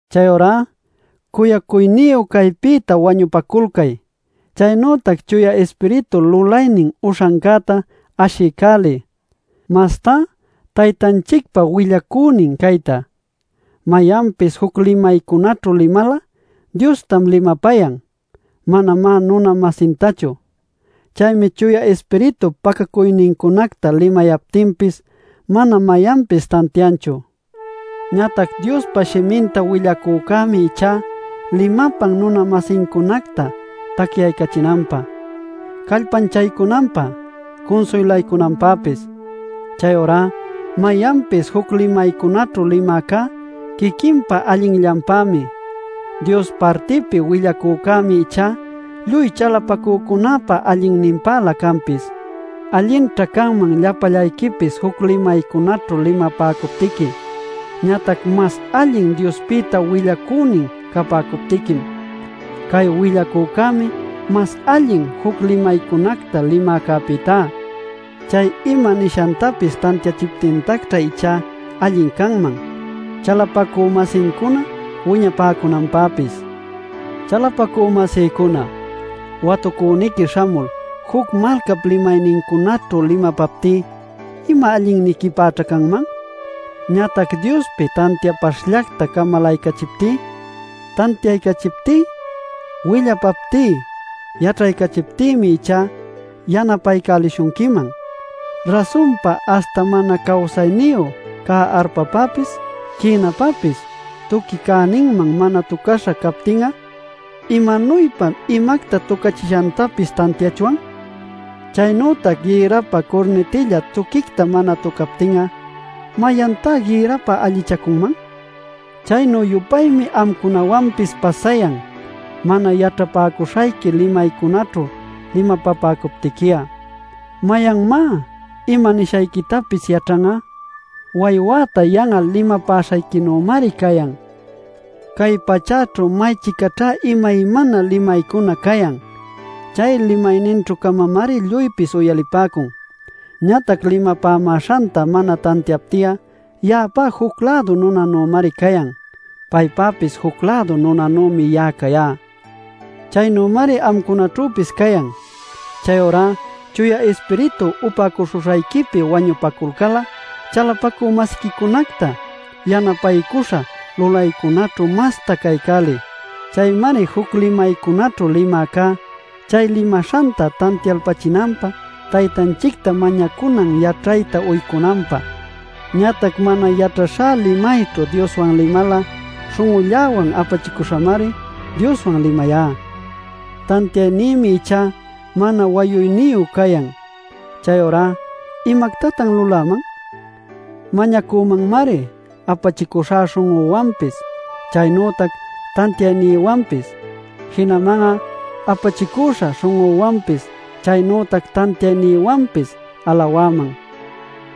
Chayurá cuyacuyniyu caypïta wañupaculcay. Chaynütac Chuya Ispiritu lulaynin uśhancäta ashiycäliy, mastá Taytanchicpa willacünin cayta. Mayanpis juc limaycunaćhu limal'a Diostam limapayan, manamá nuna-masintachu. Chaymi Chuya Ispiritup pacacuynincunacta limayaptinpis mana mayanpis tantianchu. Ñatac Diospa shiminta willacücämi ichá limapan nuna-masincunacta tacyaycächinanpä, callpanchaycunanpä, cunsuylaycunanpäpis. Chayurá mayanpis juc limaycunaćhu limäcá quiquinpa allinllanpämi. Dios partipi willacücämi ichá lluy chalapacücunäpa allinninpälä canpis. Allinćha canman llapallayquipis juc limaycunaćhu limapäcuptiqui. Ñatac mas allin Diospïta willacünin capäcuptiquim. Cay willacücämi mas allin juc limaycunacta limäcäpïtá. Chay ima nishantapis tantiachiptintacćha ichá allin canman, chalapacü-masincuna wiñapäcunanpäpis. Chalapacü-masïcuna, watucüniqui śhamul juc malcap limaynincunaćhu limapaptí, ¿ima allinniquipäćha canman? Ñatac Diospi tantiapaśhllacta camalaycachiptí, tantiaycachiptí, willapaptí, yaćhaycachiptïmi ichá, yanapaycälishunquiman. Rasunpa, aśhta mana cawsayniyu cä arpapapis quïnapapis tuqui cäninman mana tucaśha captin'a ¿imanuypam imacta tucachishantapis tantiachwan? Chaynütac gïrrapä curnitilla tuquicta mana tucaptin'a ¿mayantá gïrrapä allichacunman? Chaynü-yupaymi amcunawanpis pasayan mana yaćhapäcuśhayqui limaycunaćhu limapapäcuptiqui'a. ¿Mayanmá ima nishayquitapis yaćhan'a? Waywäta yan'al limapäśhayquinümari cayan. Cay pachäćhu may-chicaćhá imaymana limaycuna cayan. Chay limayninćhü-camamari lluypis uyalipäcun. Ñatac limapämäśhanta mana tantiapti'a, ya'apá juc-lädu nunanümari cayan; paypäpis juc-lädu nunanümi ya'a cayá. Chaynümari amcunaćhüpis cayan. Chayurá Chuya Ispiritu upäcuśhuśhayquipi wañupacuyalcal'a chalapacü-masiquicunacta yanapaycuśhan lulaycunäćhu mastá caycäliy. Chaymari juc limaycunaćhu limäcá, chay limaśhanta tantialpachinanpä Taytanchicta mañacunan yaćhayta uycunanpä. Ñatac mana yaćhaśha limayćhu Dioswan limal'a śhun'ulläwan apachicüśhamari Dioswan limayá, tantiaynïmi ichá mana wayuyniyu cayan. Chayurá ¿imactatan luläman? Mañacümanmari apachicüśha śhun'üwanpis chaynütac tantiaynïwanpis. Jinaman'a apachicüśha śhun'üwanpis chaynütac tantiaynïwanpis alawäman.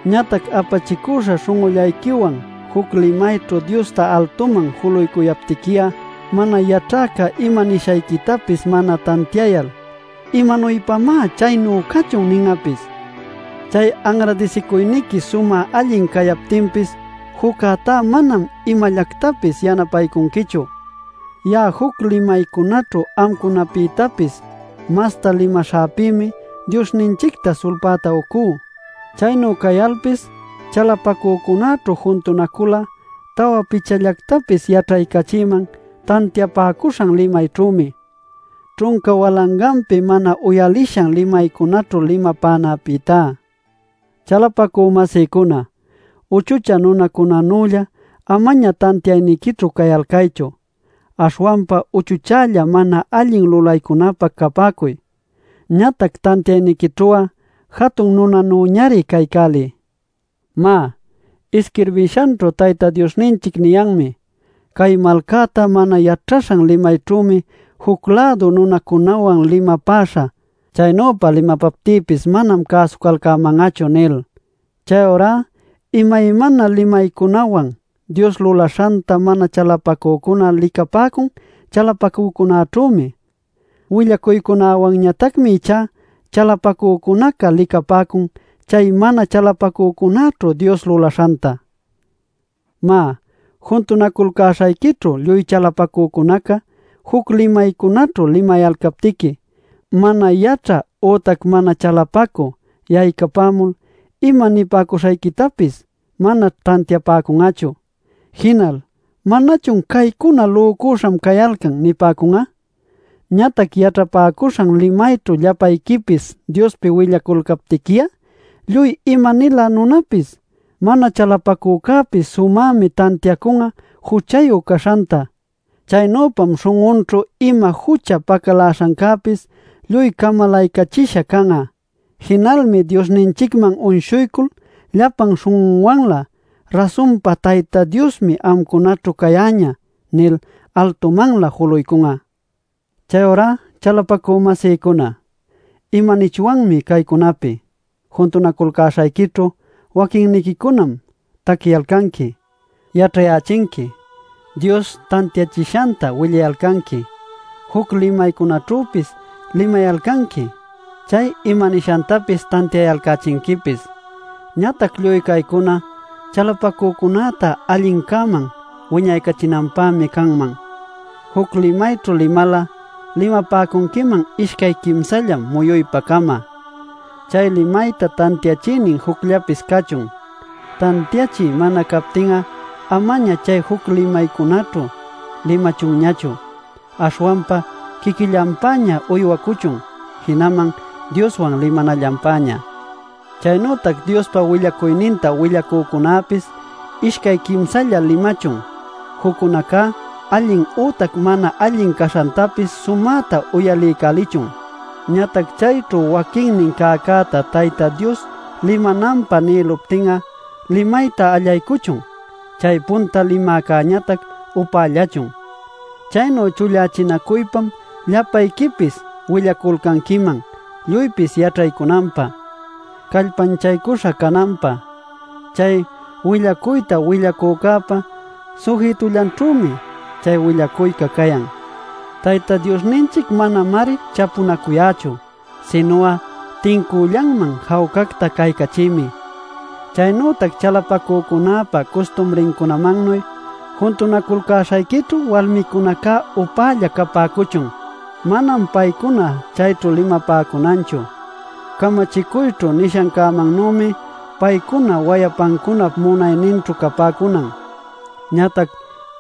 Ñatac apachicüśha śhun'ullayquiwan juc limayćhu Diosta altuman juluycuyaptiqui'a, mana yaćhäca ima nishayquitapis mana tantiayal ¿imanuypamá “chaynu cachun” nin'apis? Chay anradisicuyniqui sumä allin cayaptinpis, juccätá manam imallactapis yanapaycunquichu. Ya'a juc limaycunaćhu amcunapïtapis masta limaśhäpïmi Diosninchicta sulpäta ucú. Chaynu cayalpis chalapacücunäćhu juntunacul'a tawa pichallactapis yaćhaycachïman tantiapäcuśhan limayćhümi, ćhunca walanganpi mana uyalishan limaycunaćhu limapanäpïtá. Chalapacü-masïcuna, uchuchä nunacunänülla amaña tantiayniquićhu cayalcaychu. Aśhwanpa uchuchälla mana allin lulaycunäpä capäcuy, ñatac tantiayniquićhu'a jatun nunanüñari caycäliy. Má, isquirbishanćhu Tayta Diosninchic niyanmi: “Cay malcäta mana yaćhaśhan limayćhümi juc-lädu nunacunawan limapäśhä. ¡Chaynüpa limapaptïpis manam cäsucalcäman'achu!” nil. Chayurá imaymana limaycunawan Dios lulaśhanta mana chalapacücuna licapäcun chalapacücunäćhümi. Willacuycunäwanñatacmi ichá chalapacücunaca licapäcun chay mana chalapacücunäćhu Dios lulaśhanta. Má, juntunaculcäśhayquićhu lluy chalapacücunaca juc limaycunaćhu limayalcaptiqui, mana yaćhä ütac mana chalapacü yaycapämul ima nipäcuśhayquitapis manaćh tantiapäcun'achu. Jinal ¿manachun “Caycuná lücüśham cayalcan” nipäcun'a? Ñatac yaćhapäcuśhan limayćhu llapayquipis Diospi willacuyalcaptiqui'a, lluy ima-nilä nunapis, mana chalapacücäpis sumämi tantiacun'a juchayu caśhanta. Chaynüpam śhun'unćhu ima jucha pacaläśhancäpis lluy camalaycachisha can'a. Jinalmi Diosninchicman uyshuycul llapan śhun'unwanlä: “¡Rasunpa Tayta Diosmi amcunaćhu cayäñä!” nil altumanlä juluycun'a. Chayurá chalapacü-masïcuna, ¿imanichwanmi caycunapi? Juntunaculcäśhayquićhu waquinniquicunam taquiyalcanqui, yaćhayächinqui, Dios tantiachishanta willayalcanqui, juc limaycunaćhüpis limayalcanqui, chay imanishantapis tantiayalcächinquipis. Ñatac lluy caycuna chalapacücunäta allincäman wiñaycachinanpämi canman. Juc limayćhu limal'a limapäcunquiman ishcay quimsallam muyuypa-cama; chay limayta tantiachïnin jucllapis cachun. Tantiachï mana captin'a amaña chay juc limaycunaćhu limachunñachu. Aśhwanpa quiquillanpäña uywacuchun jinaman Dioswan limanallanpäña. Chaynütac Diospa willacuyninta willacücunäpis ishcay quimsalla limachun, juccunacá allin ütac mana allin caśhantapis sumäta uyaliycälichun. Ñatac chayćhu waquinnin cäcäta Tayta Dios limananpä nïluptin'a limayta allaycuchun; chay punta limäcäñatac upällachun. Chaynu chullachinacuypam llapayquipis willaculcanquiman lluypis yaćhaycunanpä, callpanchaycuśha cananpä. Chay willacuyta willacücäpa sujitullanćhümi chay willacuyca cayan. Tayta Diosninchic manamari chapunacuyächu. Sinu'a tincüllanman jawcacta caycachïmi. Chaynütac chalapacücunäpa custumrincunamannuy: juntunaculcäśhayquićhu walmicunaca upälla capäcuchun. Manam paycuna chayćhu limapäcunanchu. Camachicuyćhu nishancänuymi paycuna wayapancunap munayninćhu capäcunan. Ñatac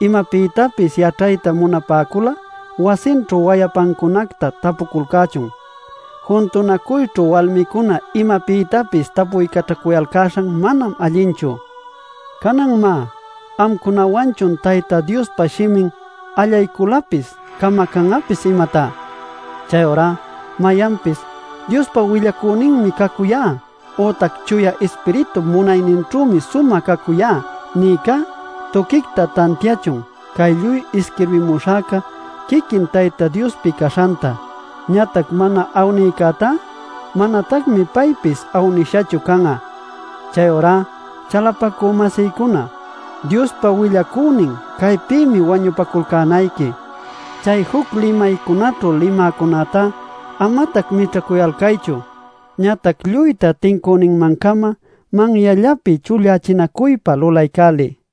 imapïtapis yaćhayta munapäcul'a wasinćhu wayapancunacta tapuculcächun; juntunacuyćhu walmicuna imapïtapis tapuycaćhacuyalcäśhan manam allinchu. Canan má ¿amcunawanchun Tayta Diospa shimin allayculapis camacan'apis, imatá? Chayurá mayanpis “Diospa willacüninmi cacuyá” ütac “Chuya Ispiritup munayninćhümi sumä cacuyá” nïcá tuquicta tantiachun cay lluy isquirbimuśhäca quiquin Tayta Diospi caśhanta. Ñatac mana awnïcätá manatacmi paypis awnishachu can'a. Chayurá chalapacü-masïcuna, Diospa willacünin caypïmi wañupaculcänayqui. Chay juc limaycunaćhu limäcunäta amatac mićhacuyalcaychu. Ñatac lluyta tincüninman-cama manyallapi chullachinacuypa lulaycäliy.